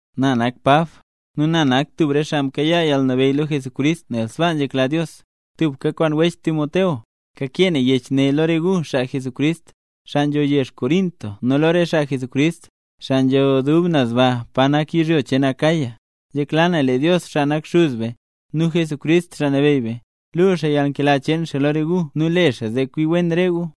Na nak Pab, nu na nak tub re xaa mkayaa yalnabeyy lo Jesucrist nel sbaa nzhekla Dios. Tubka kwaan wech Timoteo, kakee na yech ne lo re gu, xaa mle nambey Jesús, xaa nzho yezh Corinto, nu lo re xaa mle nambey Jesús, xaa nzho dub naz ba pa nak yizhyo cheen Acaya. Nzhekla na lee Dios, xaa nak Xuz be, nu Jesucrist, Xaa Nabeyy be, luu xaa yalnkela cheen xaa lo re gu nu le xaa zee kwi wen re gu.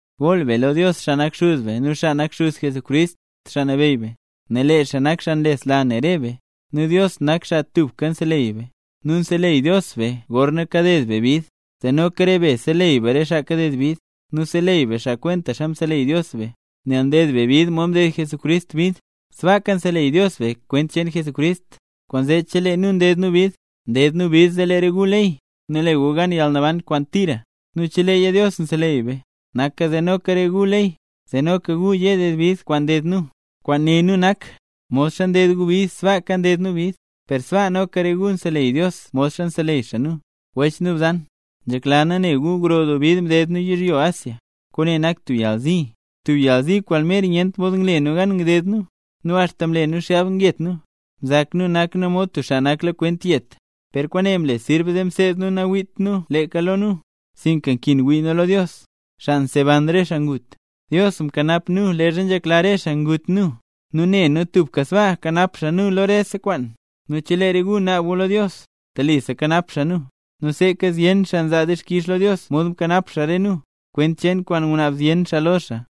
Gool be lo Dios, xaa nak Xuz be nu xaa nak Xuz Jesucrist, Xaa Nabeyy be, nel lee xaa nak xaa nlesla ne re be, nu Dios nak xaa tubka nseleyy be. Nu nseleyy Dios be gorna kaded be bid, zee noka re be seleyy re xaa kaded bid; nu seleyy be xaa kwentaxa mseleyy Dios be. Nel nded be bid mod mded Jesucrist bid, sbaaka nseleyy Dios be kwent cheen Jesucrist. Kwaanzee chelee nu nded nu bid, nded nu bid zee lee re gu leyy, nu le gu gan yalnaban kwaan tira; nu cheleeya Dios nseleyy nu, naka zee noka lee re gu leyy, zee noka gu ye ded bid kwaan nded nu. Kwaan né nu nak, modxa nded gu bid sbaaka nded nu bid, per sbaa noka re gu nseleyy Dios modxa nseleyy xaa nu. Wech nu bzan, nzhekla nu ne gu gro doo bid mded nu yizhyo Asia. Kwaane nak tub yalzi, tub yalzi kwaan mer nyent mod ngle nu gan ngded nu, nu axta mle nu xgab ngyet nu. Mzak nu nak nu mod tub xaa naklakwent yet. Per kwaane mle sirb zee mseed nu nawiit nu leeka lo nu, sinka nkin wii nu lo Dios, xaa nseban re xaa ngut. Dios mkanap nu leezha nzhekla re xaa ngut nu, nu ne nu tubka sbaa kanap xaa nu lo rese kwaan. Nu chelee re gu naab gu lo Dios, telisa kanap xaa nu; nu seeka zyen xaa nzaa dixkix lo Dios mod mkanap xaa re nu, kwent cheen kwaan ngunaab zyen xaa lo xaa.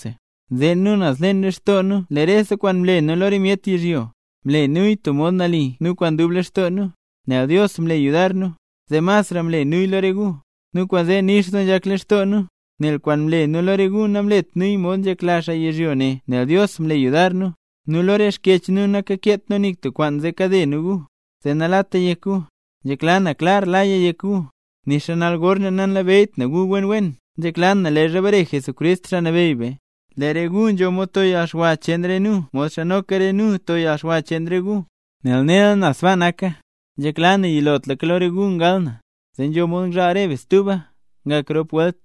Nzeen nu naz leen lextoo nu lee rese kwaan mle nu lo re myet yizhyo, mle nuya tub mod nali nu kwaan dub lextoo nu, nel Dios mle yudar nu, zee masra mle nuya lo re gu. Nu kwaanzee nix doo nzhak lextoo nu, nel kwaan mle nu lo re gu namlet nuya mod nzhak xaa yizhyo ne nel Dios mle yudar nu. Nu lo re xkyech nu nankeet nu nik tub kwaan zee kade nu gu, zee nalata yek gu. Nzhekla na klar laya yek gu. Nixa nal gor ne nanlabeyyt gu nu wen wen, nzhekla na leezha bare Jesucrist Xaa Nabeyy be, lee re gu nzho mod to gu yalxwa cheen re nu modxa noka re nu to yalxwa cheen re gu. Nel nela na sbaa naka, nzhekla na yilotlaka lo re gu ngal na, zee nzho mod ngzhaal re be stuba, ngak rop welt.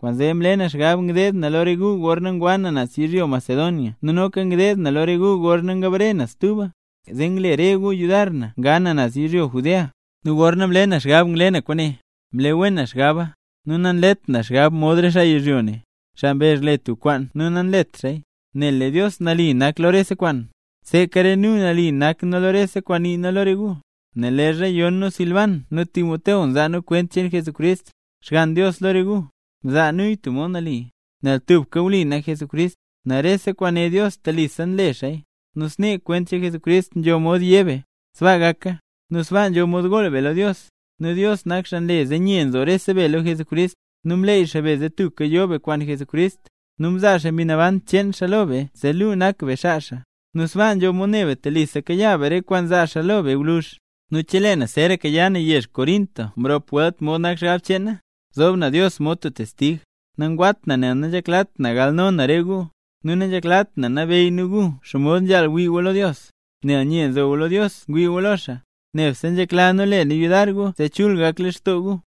Kwaanzee mle na xgab ngdeed na lo re gu gorna ngwa na naz yizhyo Macedonia nu noka ngdeed na lo re gu gorna ngbare na stuba, zee ngle re gu yudar na nga na naz yizhyo Judea. Nu gorna mle na xgab ngle na kwaane, mle wen na xgaba. Nu nanlet na xgab mod re xaa yizhyo ne, xaa mbezh le xaa tub kwaan nu nanlet xaaya. Nel lee Dios nali nak lo rese kwaan, sbaaka re nu nali nak nu lo rese kwaan nii nu lo re gu. Nel leezha yon nu Silban nu Timoteo nzaa nu kwent cheen Jesucrist, Xgann Dios lo re gu, mzaa nuya tub mod nali, nel tubka wli nak Jesucrist. Nel rese kwaan né Dios, telisa nle xaaya. Nu snee kwent cheen Jesucrist nzho mod yé be: “Sbaa gaka”, nu sbaa nzho mod gool be lo Dios. Nu Dios nak xaa nle zee nye nzo rese be lo Jesucrist, nu mleey xaa be zee tubka yo be kwaan Jesucrist, nu mzaa xaa Mbi Naban cheen xaa lo be zee luu nak be xaa xaa, nu sbaa nzho mod ne be telisa kayaa be re kwaan zaa xaa lo be gwluzh. Nu chelee na zeeraka ya na yezh Corinto mrop welt mod nak xgab cheen na, zoob na Dios mod tub testig, nagat na nel nanzheklat na galno na re gu. Nu nanzheklat nu nabeyy nu gu xomod nzhaal ngwii gu lo Dios, nel nye nzo gu lo Dios ngwii gu lo xaa, nebse nzhekla nu le nu yudar gu zee chul gak lextoo gu.